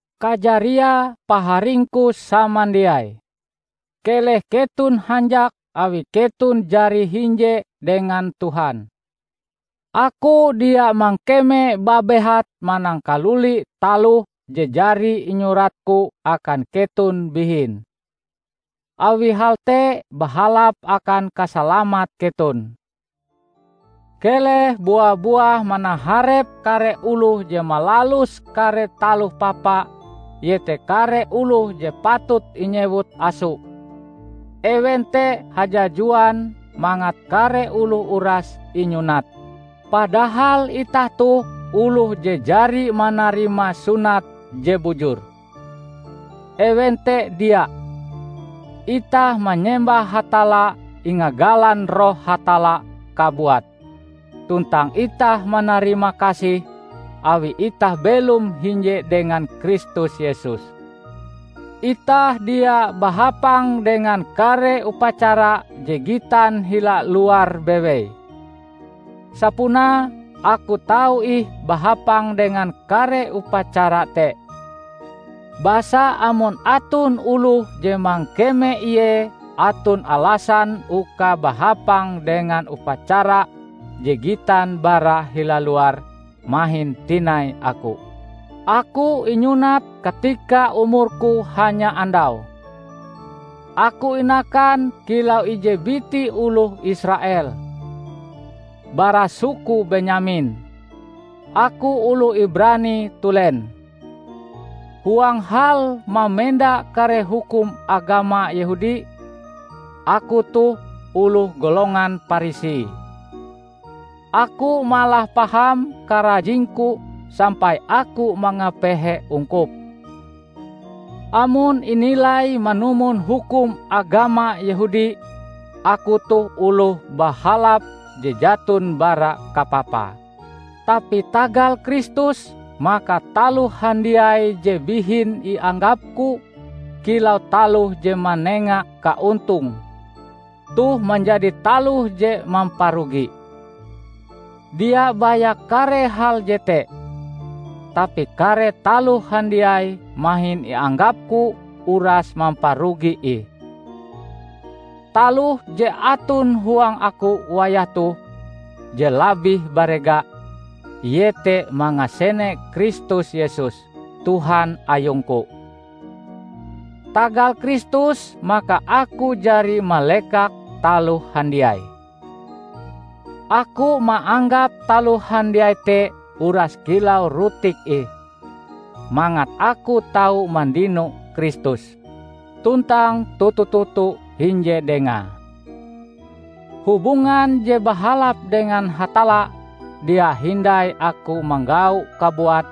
Kajariae, paharingku samandiai, keleh keton hanjak awi keton jari hinje dengan Tuhan. Aku dia mangkeme babehat manangkaluli taloh je jari inyuratku akan keton bihin; awi hal te bahalap akan kasalamat keton. Keleh bua-buah manaharep kare oloh je malalus kare taloh papa iete kare oloh je patut inyewut 'aso'. Ewen te hajajuan mangat kare oloh uras inyunat. Padahal itah toh oloh je jari manarima sunat je bujur, ewen te dia. Itah manyembah Hatalla ingagalan Roh Hatalla kabuat, tuntang itah manarimakasih awi itah belom hinje dengan Kristus Yesus. Itah dia bahapang dengan kare upacara je gitan hila luar bewei. Sapunae aku tau ih bahapang dengan kare upacara te. Basa amon aton oloh je mangkeme ie aton alasan uka bahapang dengan upacara je gitan bara hila luar, mahin tinai aku. Aku inyunat katika umurku hanya andau. Aku inakan kilau ije biti oloh Israel, bara suku Benyamin; aku oloh Ibrani tulen. Huang hal mamenda kare hukum agama Yehudi, aku toh oloh golongan Parisi. Aku malah paham karajingku sampai aku mangapehe ungkup. Amon inilai manumon hukum agama Yehudi, aku toh oloh bahalap je jaton bara kapapa. Tapi tagal Kristus, maka taloh handiai je bihin ianggapku kilau taloh je manenga kaontong, toh menjadi taloh je mamparugi. Dia baya kare hal jete; tapi kare taloh handiai mahin ianggapku uras mamparugi ih. Taloh je aton huang aku wayah toh je labih barega: iete mangasene Kristus Yesus, Tuhan ayungku. Tagal Kristus, maka aku jari malekak taloh handiai. Aku maanggap taloh handiai te uras kilau rutik ih, mangat aku tau mandino Kristus, tuntang toto-toto hinje dengae. Hubungan je bahalap dengan Hatalla dia hindai aku manggaue kabuat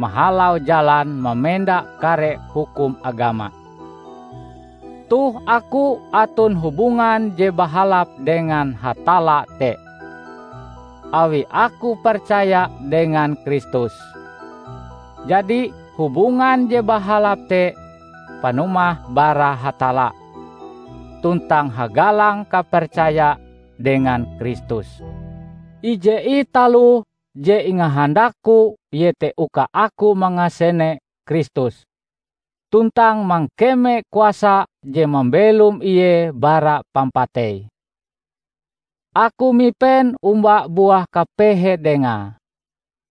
mahalau jalan mamenda kare hukum agama. Toh aku aton hubungan je bahalap dengan Hatalla te, awi aku percaya dengan Kristus. Jadi, hubungan je bahalap te panumahe bara Hatalla, tuntang hagalang kapercaya dengan Kristus. Ije ih taloh je ingahandakku iete uka aku mangasene Kristus, tuntang mangkeme kuasa je mambelom Ie bara pampatei. Aku mipen omba buah kapehe Dengae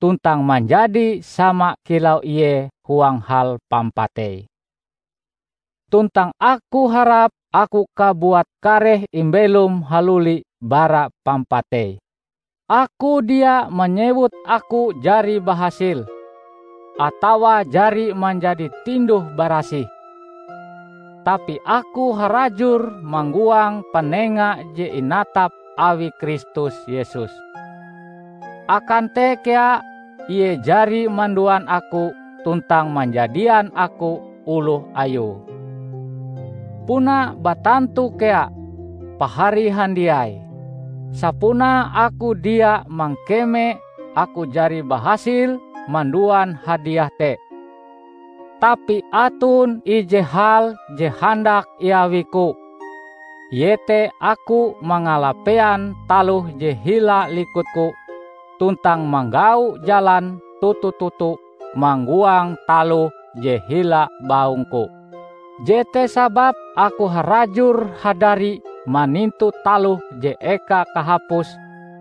tuntang manjadi sama kilau Ie huang hal pampateie. Tuntang aku harap aku kabuat kareh imbelom haluli bara pampatei. Aku dia manyewut aku jari bahasil, atawa jari manjadi tinduh-barasih. Tapi aku harajur manggoang panenga je inatap awi Kristus Yesus. Akan te kea Ie jari manduan aku tuntang manjadian aku oloh Ayue. Puna batantu kea, pahari handiai, sapunae aku dia mangkeme aku jari bahasil manduan hadiah te. Tapi aton ije hal je handak iawiku, iete aku mangalapean taloh je hila likutku tuntang manggau jalan toto-toto mangoang taloh je hila baungku. Jete sababe aku harajur hadari manintu taloh je eka kahapuse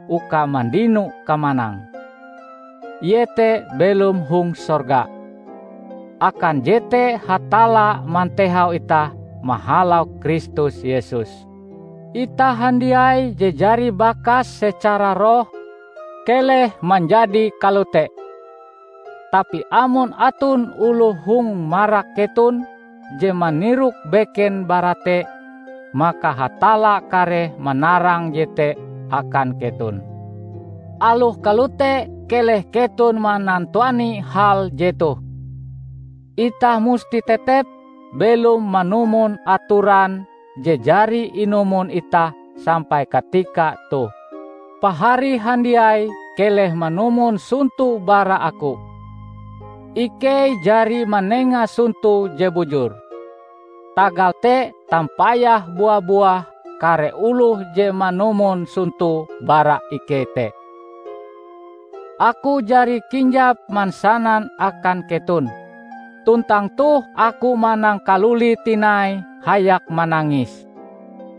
uka mandino kamanang, iete belom hong sorga; akan jete Hatalla mantehau itah mahalau Kristus Yesus. Itah handiai je jari bakas secara roh, keleh manjadi kalote. Tapi amon aton oloh hong marak keton je manirok beken bara te, maka Hatalla kareh manarang jete akan keton. Aloh kalote keleh keton manantuani hal jetoh: Itah musti tetep belom manumon atoran je jari inumon itah sampai katika toh. Pahari handiai keleh manumon sonto bara aku. Ikei jari manenga sonto je bujur, tagal te tampayah bua-buah kare oloh je manumon sonto bara ikei te. Aku jari kinjap mansanan akan keton, tuntang toh aku manangkalulie tinai hayak manangis,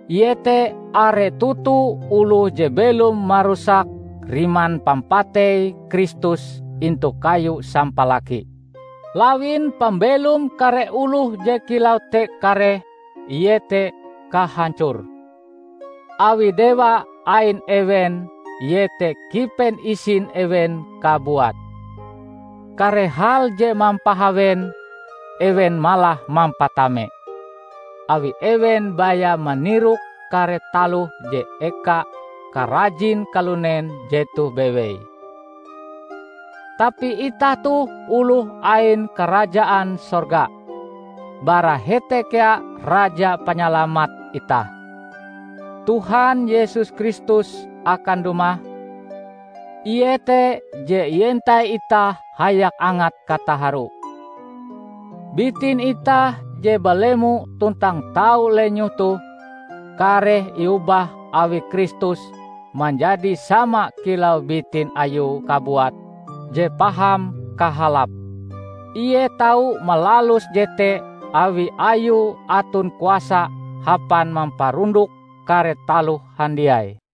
iete are toto oloh je belom marusak riman pampatei Kristus intu kayu sampalaki. Lawin pambelom kare oloh je kilau te kareh iete kahancor, awi dewa ain ewen iete kipen isin ewen kabuat. Kare hal je mampahawen, ewen malah mampatamame; awi ewen baya manirok kare taloh je eka karajin kalunen jetoh bewei. Tapi itah toh oloh ain karajaan sorga. Bara hete kea Raja Panyalamat itah, Tuhan Yesus Kristus akan dumah. Ie te je ientai itah hayak angat kataharu. Bitin itah je belemo tuntang tau lenyoh toh, kareh iobah awi Kristus manjadi sama kilau bitin Ayue kabuat je paham kahalape. Ie tau malalus jete awi Ayue aton kuasa hapan mamparundok kare taloh handiai.